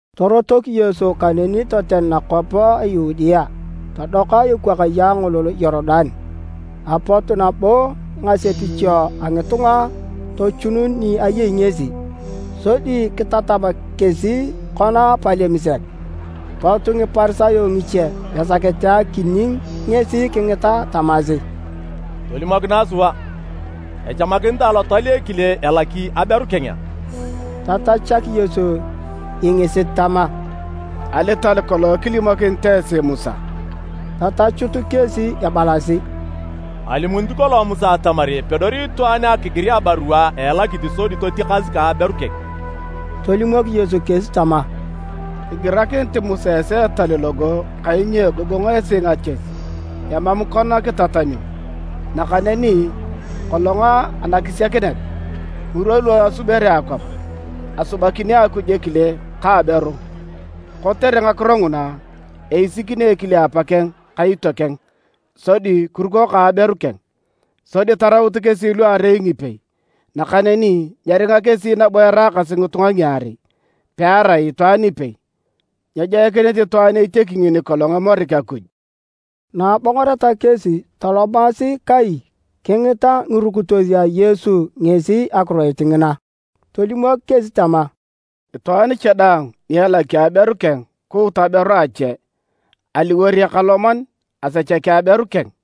Torotok Yesu kaneni toten nakwap a Yudea, todoka ekwakaye angolol a Yorudan. Apot nabo ngasepicho a ngitunga tochunun ni ayei ngesi, sodi kitatam kesi kona palem sek. Pot Ngiparisayo ngiche esakete akining ngesi kingita tamasi, “Tolimokinae sua, echamakinitae alotal ekile elaki aberu keng a?” Tatachak Yesu ingisit tama, “Alital kolong kilimokinit esi Musa?” Tatachut kesi ebalasi, “Alimunit kolong Musa atamar epedori itwaan akigir abarua a elakit sodi totiakas ka aberu keng.” Tolimok Yesu kesi tama, “Kigirakinit Musa esi etal logo kainyo egogong esi ngakies emam kona kitatamio. Nakaneni kolong anakisiakinet, ngirwa lu asubere akwap, ‘Asubakini Akuj ekile ka aberu. Kotere ngakiro nguna, eisikini ekile apakeng ka itiokeng sodi kiruko ka aberu keng, sodi taraut kesi luarei ngipei!’ Nakaneni nyeringa kesi nabo eraakasi ngitunga ngiarei, pearai itwaan ipei. Nyejoikinit itwaan etiaki ngini kolong emorik Akuj.” Na abongoreta kesi tolomasi kai, kingita ngirukitos a Yesu ngesi akiroit ngina. Tolimok kesi tama, “Itwaan cha daang ni elaki aberu keng kuut aberu ache, aliwor ekaloman asechaki aberu keng.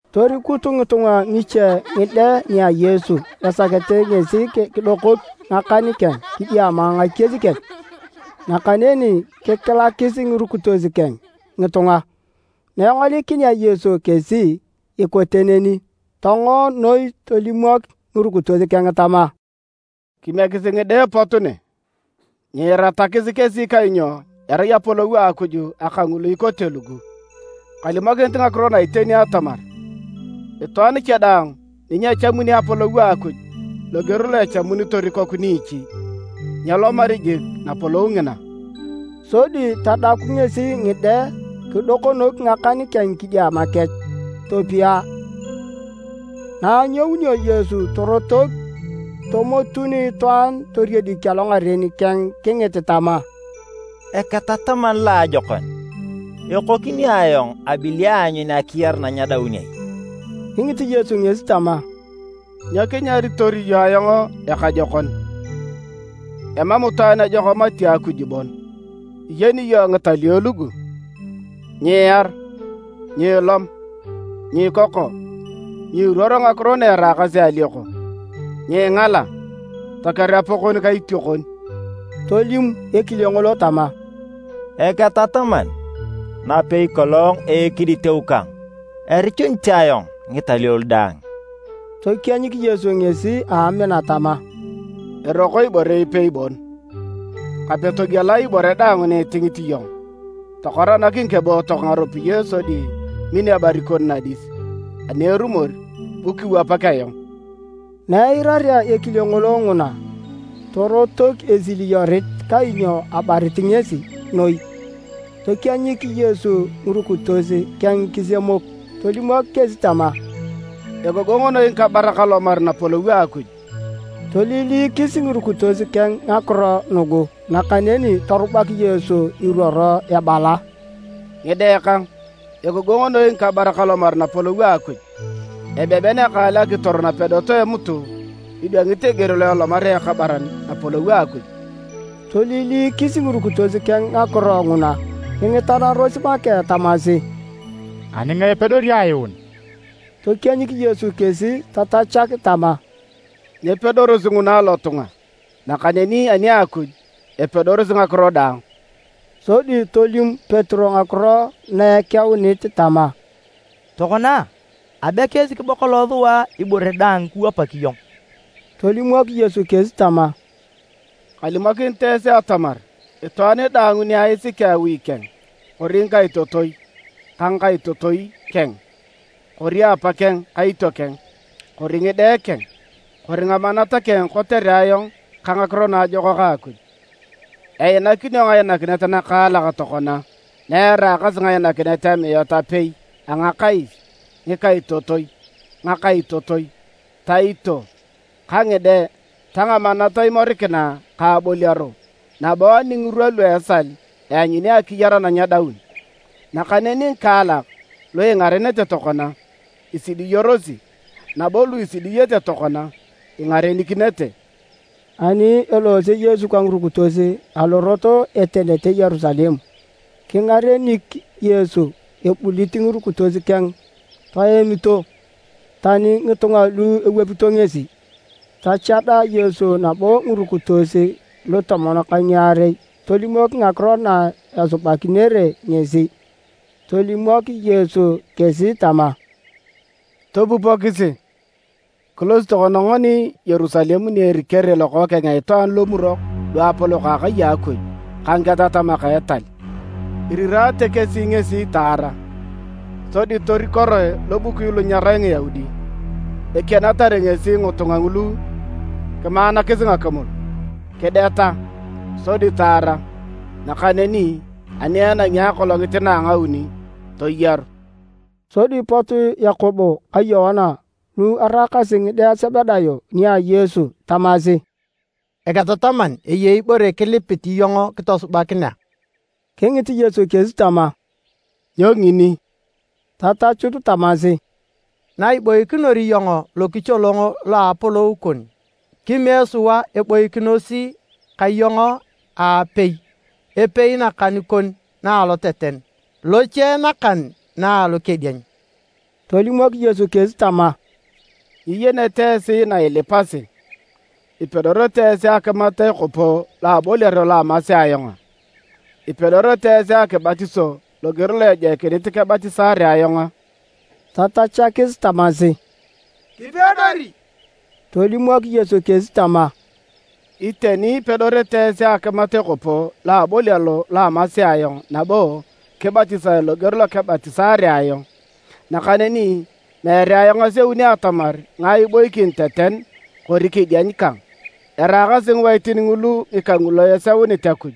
Torikut ngitunga ngiche ngide nia Yesu esakete ngesi kidokok ngakan keng kidiama ngakies kech. Nakaneni kikilakis ngirukitos keng ngitunga. Na engolikinea Yesu kesi ikote neni, tongo noi tolimok ngirukitos keng tama, “Kimiekisi ngide pot ne! Nyiiratakis kesi kainyo erai Apolou a Akuj aka ngulu ikote lugu. Kalimokinit ngakiro na iteni atamar, itwaan cha daang ni nyechamuni Apolou a Akuj loger lo echamunitor ikoku niichi, nyelomari jik Napolou ngina.” Sodi tadaku ngesi ngide kidokonok ngakan keng kidiama kech, topia. Na anyounio Yesu torotok, tomotun itwaan toriedik alongaren keng kingit tama, “Eketataman loajokon, ekokini ayong abili aanyun akiyar na nyedaun ai?” Kingit Yesu ngesi tama, “Nyo kinyaritor iyong ayong ekajokon? Emam itwaan ejok mati Akuj bon. Iyeni iyong ngitalio lugu: ‘Nyiiar, nyiilom, nyiikoko, nyiiruor ngakiro na eraakasi alioko, nyiingala, toker Apa kon ka itiokon.’” Tolim ekile ngolo tama, “Eketataman, napei kolong a ekiditeu kang, erichunit ayong ngitalio lu daang.” Tokienyik Yesu ngesi a amina tama, “Eroko ibore ipei bon. Kape togiela ibore daang ni itingit iyong tokoranak ngikebootok ngaropiyae sodi min ebarit kon nadis, ani erumor bu kiwapak ayong.” Na eirarea ekile ngolo nguna, torotok esiliyorit kainyo abarit ngesi noi. Tokienyik Yesu ngirukitos keng kisemok tolimok kesi tama, “Egogong noi ngikabarak alomar Napolou a Akuj!” Toililikis ngirukitos keng ngakiro nugu, nakaneni torubak Yesu iruoro ebala, “Ngide kang, egogong noi ngikabarak alomar Napolou a Akuj! Ebeben ekaal akitor napedot a emutu idwangit eger lo elomarea ekabaran Napolou a Akuj.” Toililikis ngirukitos keng ngakiro nguna kingitanaros make tamasi, “Ani ngae epedori ayuun?” Tokienyik Yesu kesi tatachak tama, “Nyepedorosi nguna alotunga, nakaneni ani a Akuj, epedorosi ngakiro daang.” Sodi tolim Petero ngakiro na ekeunit tama, “Tokona, abe kiisik bo kolong sua ibore daang kiwapak iyong.” Tolimok Yesu kesi tama, “Kalimokinit esi atamar itwaan daang ni aisiki awi keng, kori ngikaitotoi ka ngakaitotoi keng, kori apa ka itiokeng, kori ngide keng kori ngamanat keng kotere ayong ka Ngakiro Naajokak a Akuj, einakinio ngainakinet nakaalak tokona na eraakasi ngainakinet amiat apei a ngakais, ngikaitotoi, ngakaitotoi, taito ka ngide ta ngamanat imorikina ka aboliaro, nabo ani ngirwa lu esal eanyuni akiyar na nyedaun. Nakaneni ngikaalak lu ingarenete tokona, isidiyorosi, nabo lu isidiyete tokona, ingarenikinete.” Ani eloose Yesu ka ngirukitos alorot etenete Yerusalem, kingarenik Yesu. Abulit ngirukitos keng toemito tani ngitunga lu ewapito ngesi. Tachada Yesu nabo ngirukitos lutomon ka ngiarei tolimok ngakiro na esubakinere ngesi. Tolimok Yesu kesi tama, “Topupokisi, kilosi tokona ngoni Yerusalem ni erikere Lokookeng a Itwaan Lomurok luapolok a Akai a Akuj ka ngiketatamak a etal. Irirate kesi ngesi taara. Sodi torikoroe lobukui lu nyerai Ngiyaudi. Ekianatar ngesi ngitunga ngulu kimaanakis ngakimul, kideta sodi taara, nakaneni ani enangi akolongit na a ngauni, toyaru.” Sodi pot Yakobo ka Yoana lu eraakasi ngide a Sebedayo nia Yesu tamasi, “Eketataman, eyei ibore kilipit iyong kitosubakinea.” Kingit Yesu kesi tama, “Nyo ngini?” Tatachut tamasi, “Na iboikinor iyong lokicholong lo a Apolou kon, kimiek sua eboikinos ka iyong aapei, epei nakan kon na aloteten, loche nakan na alokedieny.” Tolimok Yesu kesi tama, “Nyiyenete esi na ilipasi. Ipedorete esi akimat ekopo lo aboliaro lo amasi ayong a? Ipedorete esi akibatiso loger lo ejoikinit kebatisaare ayong a?” Tatachakis tamasi, “Kipedori.” Tolimok Yesu kesi tama, “Iteni ipedorete esi akimat ekopo lo aboliaro lo amasi ayong nabo kibatisae loger lo kebatisaare ayong. Nakaneni meere ayong aseuni atamar ngae iboikin teten kori kedieny kang. Eraakasi ngiwaitin ngulu ngika ngulu eseunit Akuj.”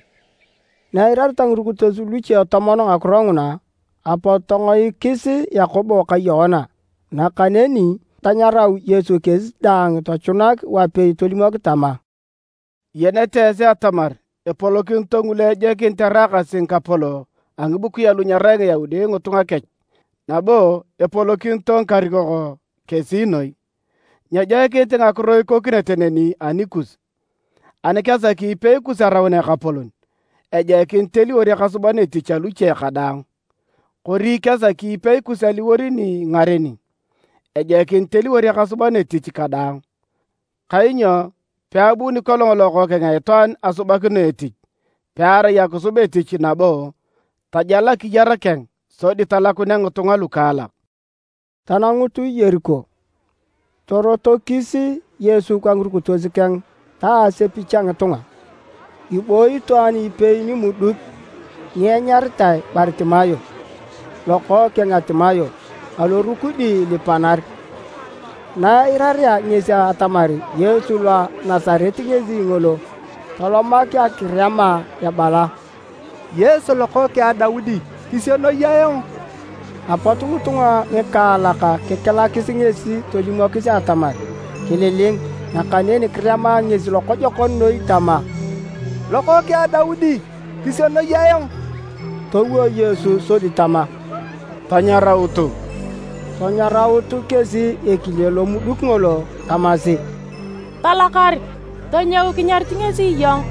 Na eirareta ngirukitos luche tomon ngakiro nguna, apot tongoikis Yakobo ka Yoana. Nakaneni tanyarau Yesu kesi daang tochunak wapei tolimok tama, “Iyenete esi atamar epolokinito ngulu ejoikinit eraakasi ngikapolok a ngibukui alu nyerai Ngiyaudi ngitunga kech nabo epolokinito ngikarikok kesi noi. Nyejoikinit ngakiro ikokinete neni anikus. Ani kesaki ipei kus araun ekapolon, ejoikinit eliwor ekasuban etich aluche kadaang, kori ani kesaki ipei kus aliwor ni ingareni, ejoikinit eliwor ekasuban etich kadaang. Kainyo peabuni kolong Lokookeng a Itwaan asubakino etich, pearai akisub etich nabo, tajal akiyar keng sodi talakunea ngitunga lukaalak.” Tanangut Yeriko. Torotokis Yesu ka ngirukitos keng ta asepich a ngitunga. Ebooyi itwaan ipei nimuduk nianyaritae Baritimayo lokookeng a Timayo alorukudi ilipanar. Na eirarea ngesi atamar Yesu lo a Nasaret ngesi ngolo, tolomak akirema ebala, “Yesu Lokookeng a Daudi, kisienoi ayong!” Apot ngitunga ngikaalak kikilakis ngesi tolimokis atamar kililing. Nakaneni kirema ngesi lokojokon noi tama, “Lokookeng a Daudi, kisienoi ayong!” Towo Yesu sodi tama, “Tanyarautu!” Tanyaraut kesi ekile lomuduk ngolo tamasi, “Talakar, tonyou kinyarit ngesi iyong.”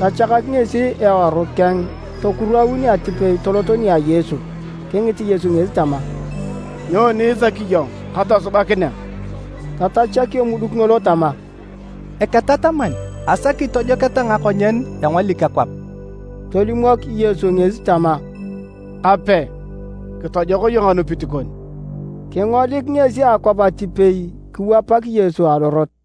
Tachaka ngesi eworu keng, tokuraun atipei tolot nia Yesu. Kingit Yesu ngesi tama, “Nyoni isaki iyong katosubakinea?” Tatachak emuduk ngolo tama, “Eketataman, asaki tojoketa ngakonyen engolik akwap.” Tolimok Yesu ngesi tama, “Kape kitojok iyong anupit kon.” Kingolik ngesi akwap atipei kiwapak Yesu alorot.